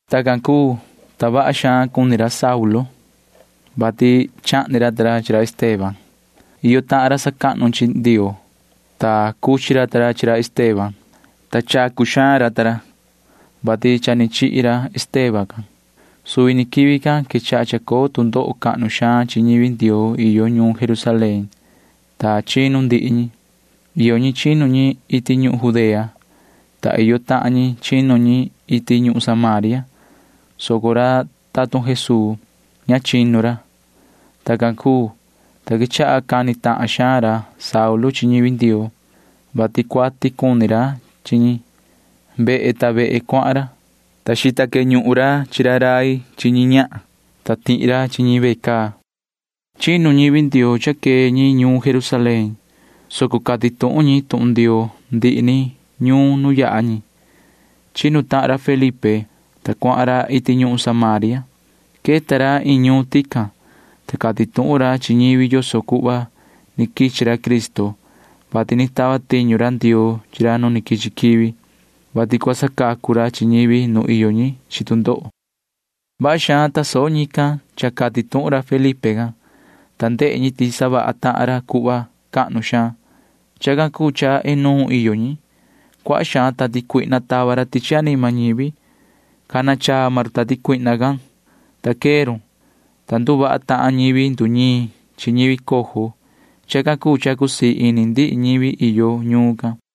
Tacan cuu, ta vaha xaan cuni ra Saulu, vati chahni ra ta ra chi ra Esteban. Iyo tahan ra sacahnu chi Ndioo, ta cuchi ra ta ra chi ra Esteban, ta chacu xaan ra suhva, vati cha ni chihi ra Esteban can. Suvi ni quivi can quechaha chacoo tu ndoho cahnu xaan chi ñivi Ndioo iyo ñuun Jerusalén, ta chinu ndihi ñi. Iyo ñi chinu ñi iti ñuhun Judea, ta iyo tahan ñi chinu ñi iti ñuhun Samaria, soco ra tatun Jesuu―ña chinu ra. Tacan cuu, ta quechaha cani tahan xaan ra Saulu chi ñivi Ndioo, vati cuati cuni ra chi ñi. Vehe ta vehe cuahan ra, ta xita queñuhun ra chi ra rai chi ñi ñahan, ta tihi ra chi ñi ve caa. Chinu ñivi Ndioo cha quee ñi ñuun Jerusalén, soco cati tuhun ñi tuhun Ndioo ndihi ni ñuun nu yaha ñi. Chinu tahan ra Felipe, ta cuahan ra iti ñuhun Samaria. Queta ra iin ñuun tican, ta cati tuhun ra chi ñivi yoso cuhva ni quichi ra Cristo, vati ni tava tiñu ra Ndioo chi ra nu quichi quivi, vati cua sacacu ra chi ñivi nu iyo ñi chi tu ndoho. Vaha xaan tasoho ñican cha cati tuhun ra Felipe can, ta ndehe ñi ti savaha tahan ra cuhva cahnu xaan. Chacan cuu cha inuun iyo ñi. Cuaha xaan tati cuihna tava ra tichi anima ñivi. Cana chaa maan run tati cuihna can, ta quee run, ta nduvaha tahan ñivi nduñiin chi ñivi cojo. Chacan cuu cha cusii ini ndihi ñivi iyo ñuun can.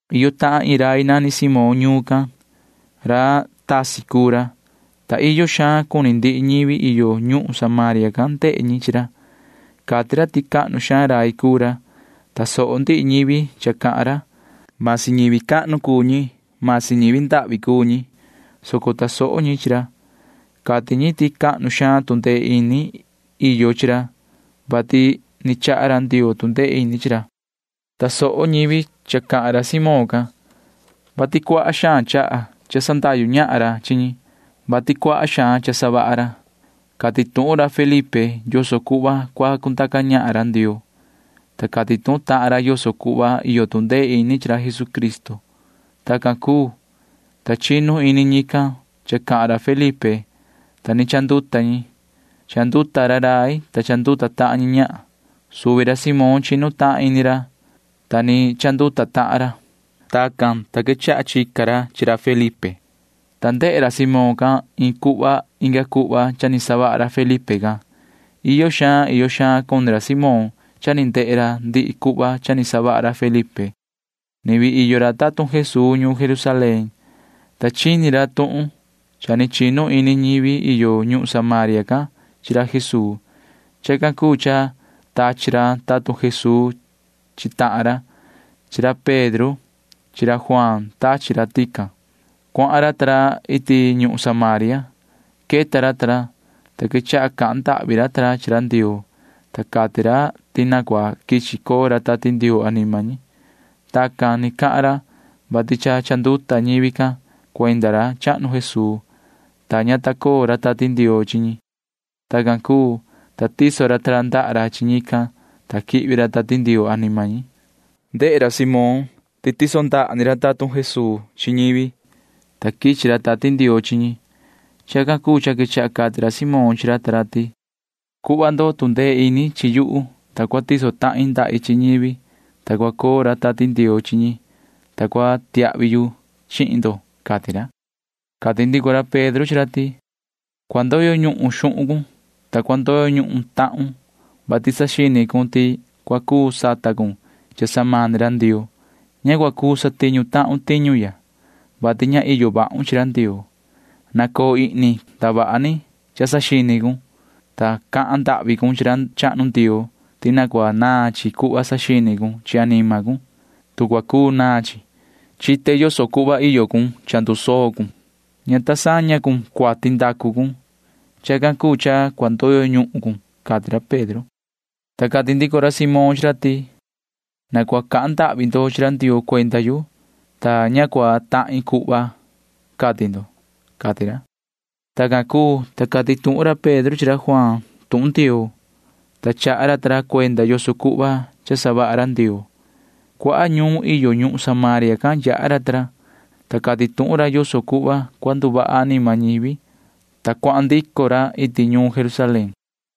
Iyo tahan iin rai nani Simón ñuun can. Ra tasi cuu ra, ta iyo xaan cuni ndihi ñivi iyo ñuhun Samaria can ndehe ñi chi ra. Cati ra ti cahnu xaan rai cuu ra. Tasoho ndihi ñivi cha cahan ra. Vasi ñivi cahnu cuu ñi, vasi ñivi ndahvi cuu ñi, soco tasoho ñi chi ra. Cati ñi ti cahnu xaan tu ndee ini iyo chi ra, vati ni chaha ra Ndioo tu ndee ini chi ra. Tasoho ñivi cha cahan ra Simón can, vati nahan xaan cha sandahyu ñahan ra chi ñi, vati cuaha xaan cha savaha ra. Cati tuhun ra Felipe yoso cuhva cua cundaca ñahan ra Ndioo, ta cati tuhun tahan ra yoso cuhva iyo tu ndee ini chi ra Jesucristo. Tacan cuu, ta chinu ini ñican cha cahan ra Felipe, ta ni chanduta ñi. Chanduta ra rai, ta chanduta tahan ñi ñahan. Suvi ra Simón chinu tahan ini ra, ta ni chanduta tahan ra. Tacan, ta quechaha chica ra chi ra Felipe, ta ndehe ra Simón can iin cuhva inga cuhva cha ni savaha ra Felipe can. Iyo xaan iyo xaan cuni ra Simón cha ni ndehe ra ndihi cuhva cha ni savaha ra Felipe. Ni vii iyo ra tatun Jesuu ñuun Jerusalén, ta chini ra tuhun cha ni chinu ini ñivi iyo ñuhun Samaria can chi ra Jesuu. Chacan cuu cha tachi ra tatun Jesuu chi tahan ra. Chi ra Pedro chi ra Juaan tachi ra tican. Cuahan ra ta ra iti ñuhun Samaria. [Queta ra ta ra,] ta quechaha cahan ndahvi ra ta ra chi ra Ndioo, ta cati ra ti na cua quichi coo ra Tati Ndioo anima ñi. Tacan ni cahan ra, vati cha chanduta ni ñivi can cuenda ra chahnu Jesuu, ta ña ta coo ra Tati Ndioo chi ñi. Tacan cuu, ta tiso ra ta ra ndaha ra chi ñican, ta quihvi ra Tati Ndioo anima ñi. Ndehe ra Simón ti cha ni tiso ni ra tatun Jesuu ndaha ra chi ñivi, ta quichi ra Tati Ndioo chi ñi. Chacan cuu cha quechaha cati ra Simón chi ra ta ra ti: ―Cuhva ndo tu ndee ini chi yuhu, ta cua tiso tahin ndahi chi ñivi, ta cua coo ra Tati Ndioo chi ñi, ta cua tiahvi yu chihin ndo ―cati ra. Cati ndico ra Pedro chi ra ti: ―Cua ndoyo ñuhun xuhun cun, ta cua ndoyo ñuhun tahun, vati saxini cun ti cua cuu sata cun cha samani ra Ndioo. Ña cua cuu satiñu tahun tiñu ya, vati ña iyo vahun chi ra Ndioo. Nacoo ihni cun ndavaha ni cha saxini cun, ta cahan ndahvi cun chi ra chahnu Ndioo ti na cua naan chi cuhva saxini cun chi anima cun, tu cua cuu naan chi. Chite yoso cuhva iyo cun. Cha ndusoo cun. Ña ta saña cun cuati ndacu cun. Chacan cuu cha cua ndoyo ñuhun cun ―cati ra Pedro. Ta cati ndico ra Simón chi ra ti: ―Na cua cahan ndahvi ndo chi ra Ndioo cuenda yu, ta ña cua tahin cuhva cati ndo ―cati ra. Tacan cuu, ta cati tuhun ra Pedro chi ra Juaan tuhun Ndioo, ta chaha ra ta ra cuenda yoso cuhva cha savaha ra Ndioo. Cuaha ñuun iyo ñuhun Samaria can yaha ra ta ra, ta cati tuhun ra yoso cuhva cua nduvaha anima ñivi, ta cuahan ndico ra iti ñuun Jerusalén.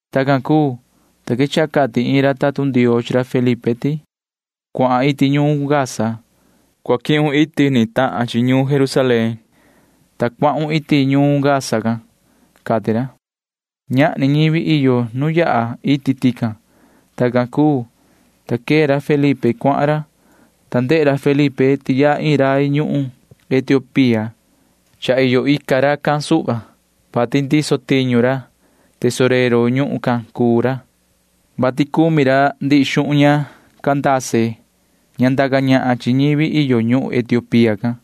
Tacan cuu, ta quechaha cati iin ra tatun Ndioo chi ra Felipe ti: ―Cuahan iti ñuun Gaza. Cua quihun iti ni tahan iti ñuun Jerusalén, ta cuahun iti ñuun Gaza can ―cati ra. Ñahni ñivi iyo nu yaha iti tican. Tacan cuu, ta quee ra Felipe cuahan ra, ta ndehe ra ti yaha iin rai ñuhun Etiopía. Cha iyo ica racan suhva, vati ndiso tiñu ra. Tesorero ñuhun can cuu ra, vati cumi ra ndihi xuhun ña Candace ña ndaca ñahan chi ñivi iyo ñuhun Etiopía can.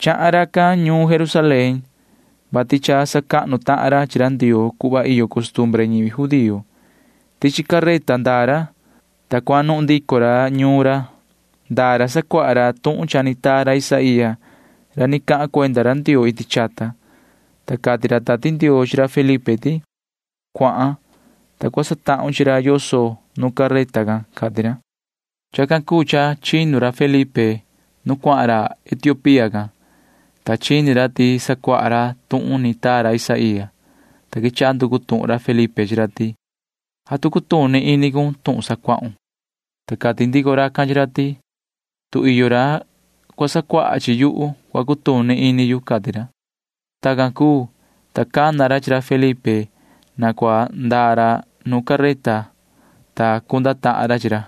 Chahan racan ñuun Jerusalén, vati cha sacahnu tahan ra chi ra Ndioo cuhva iyo costumbre ñivi judío. Tichi careta ndaa ra, ta cuanuhun ndico ra ñuun ra. Ndaa ra sacuaha ra tuhun cha ni taa ra Isaía ra ni cahan cuenda ra Ndioo iti chata, ta cati ra Tati Ndioo chi ra Felipe ti: ―Cuahan, ta cua satahun chi ra yoso nu careta can ―cati ra. Chacan cuu cha chinu ra Felipe nu cuahan ra Etiopía can, ta chini ra ti sacuaha ra tuhun ni taa ra Isaía, ta quechaha nducu tuhun ra Felipe chi ra ti: ―¿Atu cutuni ini cun tuhun sacuahun? Ta cati ndico racan chi ra ti: ―Tu iyo ra cua sacuaha chi yuhu, cua cutuni ini yu ―cati ra. Tacan cuu, ta cana ra chi ra Felipe na cua ndaa ra nu careta, ta cunda tahan ra chi ra.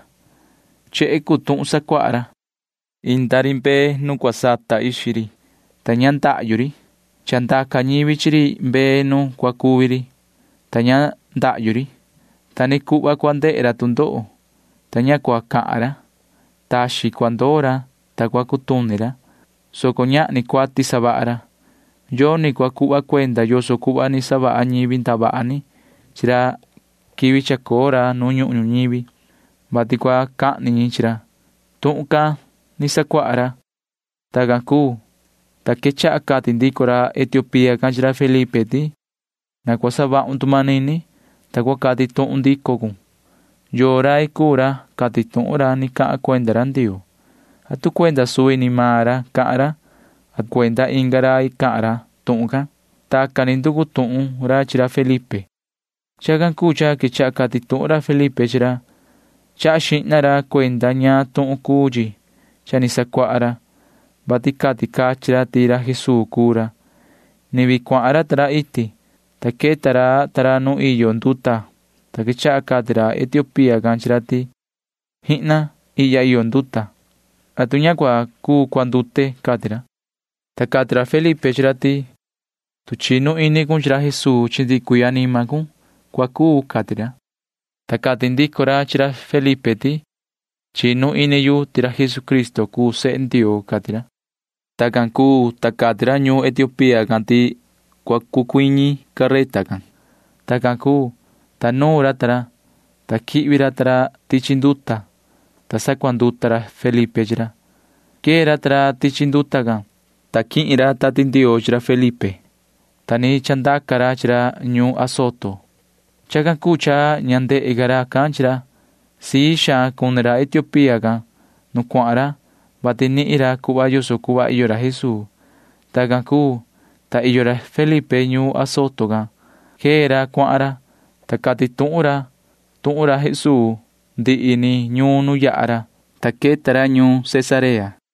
Chehe cuu tuhun sacuaha ra. Inda ri mbee nu cua sata ixi ri, ta ña ndahyu ri. Cha ndaca ñivi chi ri mbee nu cua cuvi ri, ta ña ndahyu ri. Ta ni cuhva cua ndehe ra tu ndoho, ta ña cua cahan ra. Taxin cua ndoo ra, ta cua cutuni ra, soco ñahni cuati savaha ra. Yoni cua cuhva cuenda yoso cuhva ni savaha ñivi ndavaha ni chi ra quivi chacoo ra nu ñuhun ñuñivi, vati cua cahni ñi chi ra. Tuhun can ni sacuaha ra. Tacan cuu, ta quechaha cati ndico ra Etiopía can chi ra Felipe ti: ―Na cua savahun tu manini, ta cua cati tuhun ndico cun. ¿Yoo rai cuu ra cati tuhun ra ni cahan cuenda ra Ndioo? ¿Atu cuenda suvi ni maan ra cahan ra? ¿Atu cuenda inga rai cahan ra tuhun can? Tacan ni nducu tuhun ra chi ra Felipe. Chacan cuu cha quechaha cati tuhun ra Felipe chi ra. Chaha xihna ra cuenda ñaan tuhun cuu chi cha ni sacuaha ra, vati cati cachin ra ti ra Jesuu cuu ra. Ni vii cuahan ra ta ra iti, ta queta ra ta ra nu iyo nduta, ta quechaha cati ra Etiopía can chi ra ti: ―¡Jihna! Ihya iyo nduta. ¿Atu ña cua cuu cuandute? ―cati ra. Ta cati ra Felipe chi ra ti: ―Tu chinu ini cun chi ra Jesuu chi ndihi cuii anima cun, cua cuu ―cati ra. Ta cati ndico ra chi ra Felipe ti: ―Chinu ini yu ti ra Jesucristo cuu sehe Ndioo ―cati ra. Tacan cuu, ta cati ra ñu Etiopía can ti cua cucuiñi careta can. Tacan cuu, ta nuun ra ta ra, ta quihvi ra ta ra tichi nduta, ta sacuanduta ra Felipe chi ra. Quee ra ta ra tichi nduta can, ta quihin ra Tati Ndioo chi ra Felipe, ta ni chandaca ra chi ra ñuun Azoto. Chacan cuu cha ña ndehe ca racan chi ra. Sii xaan cuni ra Etiopía can nu cuahan ra, vati nihin ra cuhva yoso cuhva iyo ra Jesuu. Tacan cuu, ta iyo ra Felipe ñuun Azoto can. Quee ra cuahan ra, ta cati tuhun ra tuhun Jesuu ndihi ni ñuun nu yaha ra, ta queta ra ñuun Cesarea.